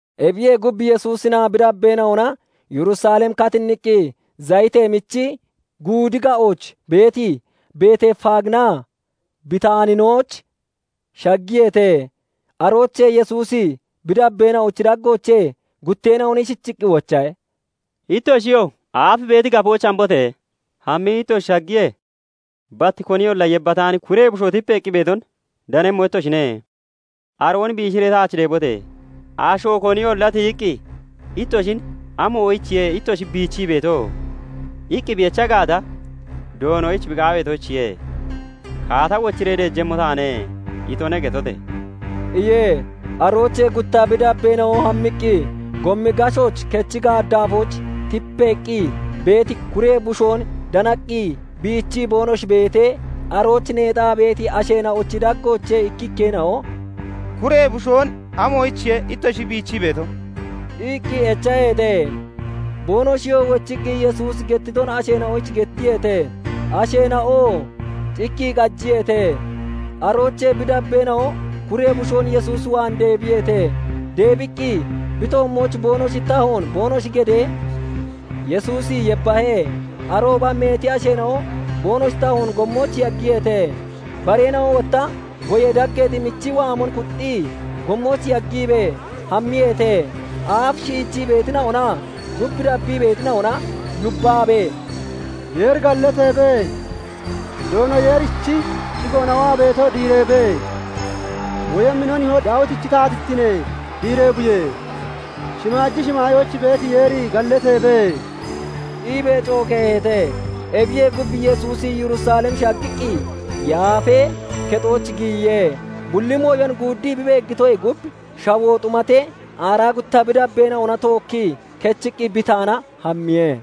Ebiyee gub, Yesuusinaa bi dabbeena'ona Yerusalem katinniqqi, Zayitee Michi Guudi ga'ooch beeti Beetefaaginaa Bitaaninooch shaggiyeete. Aroochee Yesuusi bi dabbeena'ochi daggoochee gutteena'on ishichiqqi wochahe; "Ittoshiyoo aaf beeti gafooch hambote! Hammii ittoshi shaggiyee, bat koniyolla yebbataani kuree bushoo tipeeqqi beeton danemmo ittoshine; aroon biishiree taach deebote! Asho koniyolla tiyiqqi ittoshin 'Amoyichiye ittoshi bichii beeto?' iqqi bi echa gaata, 'Doonoyich bi qaaweetoyichiye. "Kaata wochiree deejemmo taane" itone' getote!" iye. Aroochee gutta bi dabbeena'o hammiqqi gommi gashooch, kechi gaaddaafooch tipeeqqi beeti kuree bushoon danaqqi bichii boonoshi beetee, arooch neexaa beeti asheena'ochi daggoochee ikkikkeena'o "Kuree bushoon amoyichiye ittoshi bichii beeto?" iqqi echaheete. Boonoshiyoo wochiqqi Yesuusi gettiton asheena'oyich gettiyeete; asheena'oo cikkii qajiyeete. Aroochee bi dabbeena'o kuree bushoon Yesuus waan deebiyeete. Deebiqqi bi toommooch boonoshi tahoon boonoshi gedee, Yesuusi yebbahe. Arooba meeti asheena'o boonoshi tahoon gommooch yaggiyeete. Bareena'o wotta goyee daggeexi michi waamon kuxxii gommooch yaggiibee hammiyeete. Aaf shiichii beetina'onaa gub dabbii beetina'ona yubbaabee, "Yeeri gallateebe! Doono Yeerichi shigoona waa beeto diireebe! woyemmi no nihoo Daawitichi taatittine diireeboye! shimaaji shimaayooch beeti Yeeri gallateebe!" iibee cokeeheete. Ebiyee gub, Yesuusi Yerusalem shaggiqqi Yaafee Kexooch giyiye. Bulli mooyon guuddii bi beeggitoyee gub shawoo xumatee aaraa gutta bi dabbeena'ona tookkii kechiqqi Bitaana hammiye.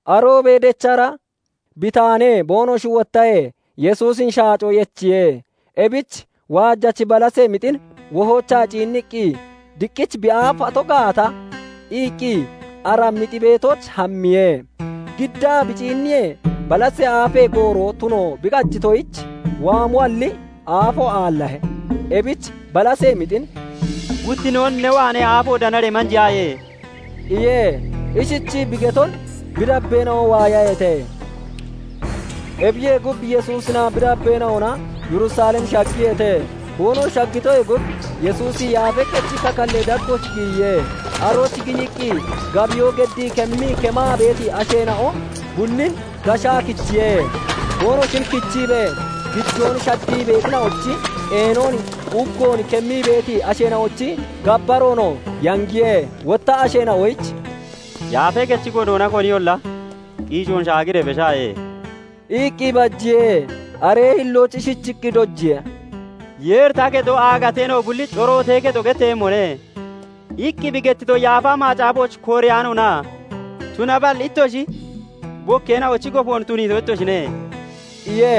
Aroobee dechra Bitaanee boonoshi wottahee, Yesuusin shaacoo yechiye. Ebich waajachi balasee mixin wohoochaa ciinniqqi, 'Diqqich bi aafato gaata' iqqi ara mixi beetooch hammiye. Giddaa bi ciinniyee, balasee aafee gooro tuno bi qajitoyich waamoalli aafo aallahe. Ebich balasee mixin "Guttinnoon ne waanee aafo danaree manjeyaaye" iye. Ishichii bi geton bi dabbeena'o waayaheete. Ebiyee gub, Yesuusinaa bi dabbeena'ona Yerusalem shaggiyeete. Boonoshi shaggitoyee gub Yesuusi Yaafee Kechi kakallee daggooch giyiye. Arooch giyiqqi, gabiyoo geddii kemmii kemaa beeti asheena'o bullin gashaa kichiye. Boonoshin kichiibee, gijoon shaddii beetina'ochi qeenon, uggon kemmii beeti asheena'ochi gabbaroonoo yangiye. Wotta asheena'oyich "Yaafee Kechi godoona koniyolla qiicoon shaagiree beshaaye" iqqi bajiye. Aree hillooch ishichiqqi dojiye; " Yeeri 'Ta kexo "Aagateena'o bullichi corootee kexo" getteeyemmone' iqqi bi gettito Yaafa Macaafooch kooreyaanoona? Tunaballi ittoshi 'Bokkeena'ochi gofoon' tuniito ittoshine" iye.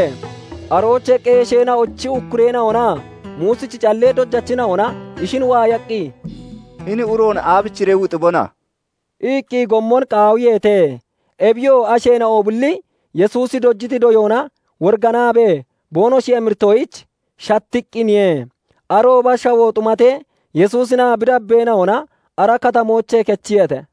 Aroochee qeesheena'ochi ukkureena'onaa Muusichi callee dojachina'ona ishin waayaqqi, "Hini uroon aabichiree wuxibona?" iqqi gommon qaawiyeete. Ebiyoo asheena'o bulli Yesuusi dojiti doyoona woriganaabee boonoshi emiritoyich shattiqqiniye. Arooba shawoo xumatee, Yesuusinaa bi dabbeena'ona ara katamoochee kechiyeete.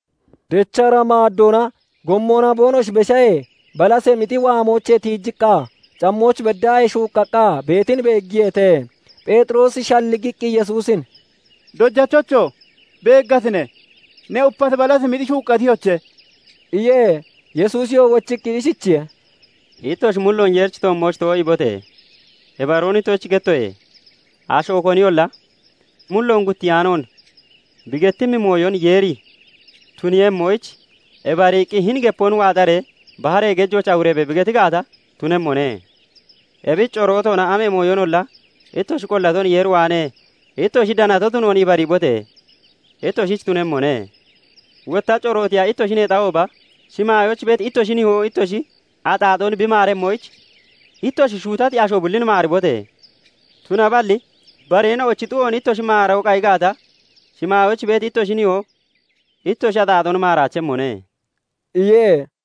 Dechra maaddoona gommona boonoshi beshahee, balasee mixi waamoochee tiijiqqa cammooch beddaahee shuuqqaqqa beetin beeggiyeete. Pheexiroosi shalligiqqi Yesuusin "Dojachocho! Beeggatine? Ne upati balasee mixi shuuqqatiyoche!" iye. Yesuusiyoo wochiqqi ishichiye:- "Ittoshi mulloon Yeerichi toommooch too'iibote! Ibaroon ittoshich gettoye; asho koniyolla mulloon guttiyaanoon bi gettimmi mooyon Yeeri tuniiyemmoyich ibariiqqi, hini gepoon 'Waaxaree baharee gejooch awureebe!' bi geti gaata, tunemmone. Ebich corootoona amee mooyonolla ittoshi qollaton Yeer waanee ittoshi danato tunoon ibariibote! Ittoshich tunemmone. Wotta corootiya ittoshi neexahooba, shimaayooch beeti ittoshi nihoo ittoshi axaaxoon bi maaremmoyich, ittoshi shuutati asho bullin maaribote! [Tunaballi bareena'ochi xu'oon ittoshi maaroo qayi gaata, shimaayooch beeti ittoshi nihoo ittoshi axaaxoon maaraachemmone" iye.]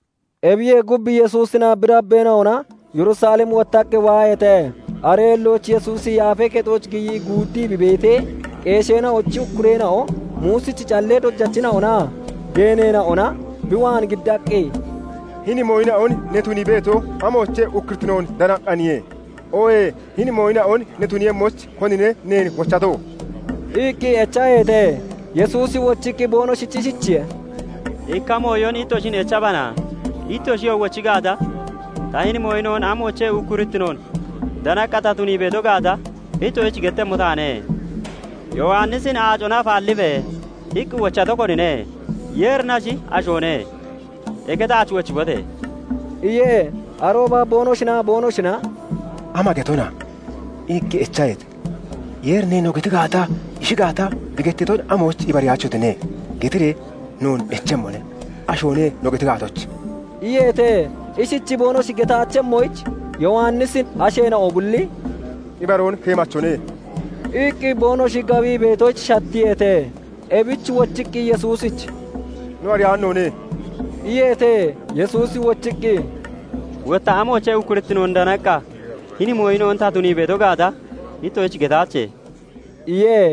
Ebiyee gub, Yesuusinaa bi dabbeena'ona Yerusalem wottaqqi waaheete. Aree hillooch Yesuusi Yaafee Kexooch giyii guuddii bi beetee, qeesheena'ochi ukkureena'o, Muusichi callee dojachina'onaa geeneena'ona bi waan giddaqqi, "Hini mooyina'on ne tunii beeto, amoochee ukkurittinoon danaqqaaniye? Oohee hini mooyina'on ne tuniiyemmoyich konine neen wochato?" iqqi echaheete. Yesuusi wochiqqi boonoshich ishichiye:- "Ikka mooyon ittoshin echbana; ittoshiyoo wochi gaata, ta hini mooyina'on amoochee ukkurittinoon danaqqa ta tunii beeto gaata ittoshich gettemmo taane. Yowannisin 'Aacona afaallibe!' iqqi wochato konine? Yeerinashi, ashoone? Eke taach wochibote!" iye. Arooba boonoshinaa boonoshina "Ama getona?" iqqi echeeheete. " 'Yeerine' no geti gaata, 'Ishi gaata, bi gettiton amoyich ibariyaachotine?' getiree noon echemmone. 'Ashoone' no geti gaatoche?" iyeete. Ishichi boonoshi getaachemmoyich, Yowannisin asheena'o bulli "Ibaroon keemachone" iqqi boonoshi gabii beetoyich shattiyeete. Ebich wochiqqi Yesuusich "No ariyaano noone" iyeete. Yesuusi wochiqqi, "Wotta amoochee ukkurittinoon danaqqa hini mooyina'on ta tunii beeto gaata ittoshich getaache" iye.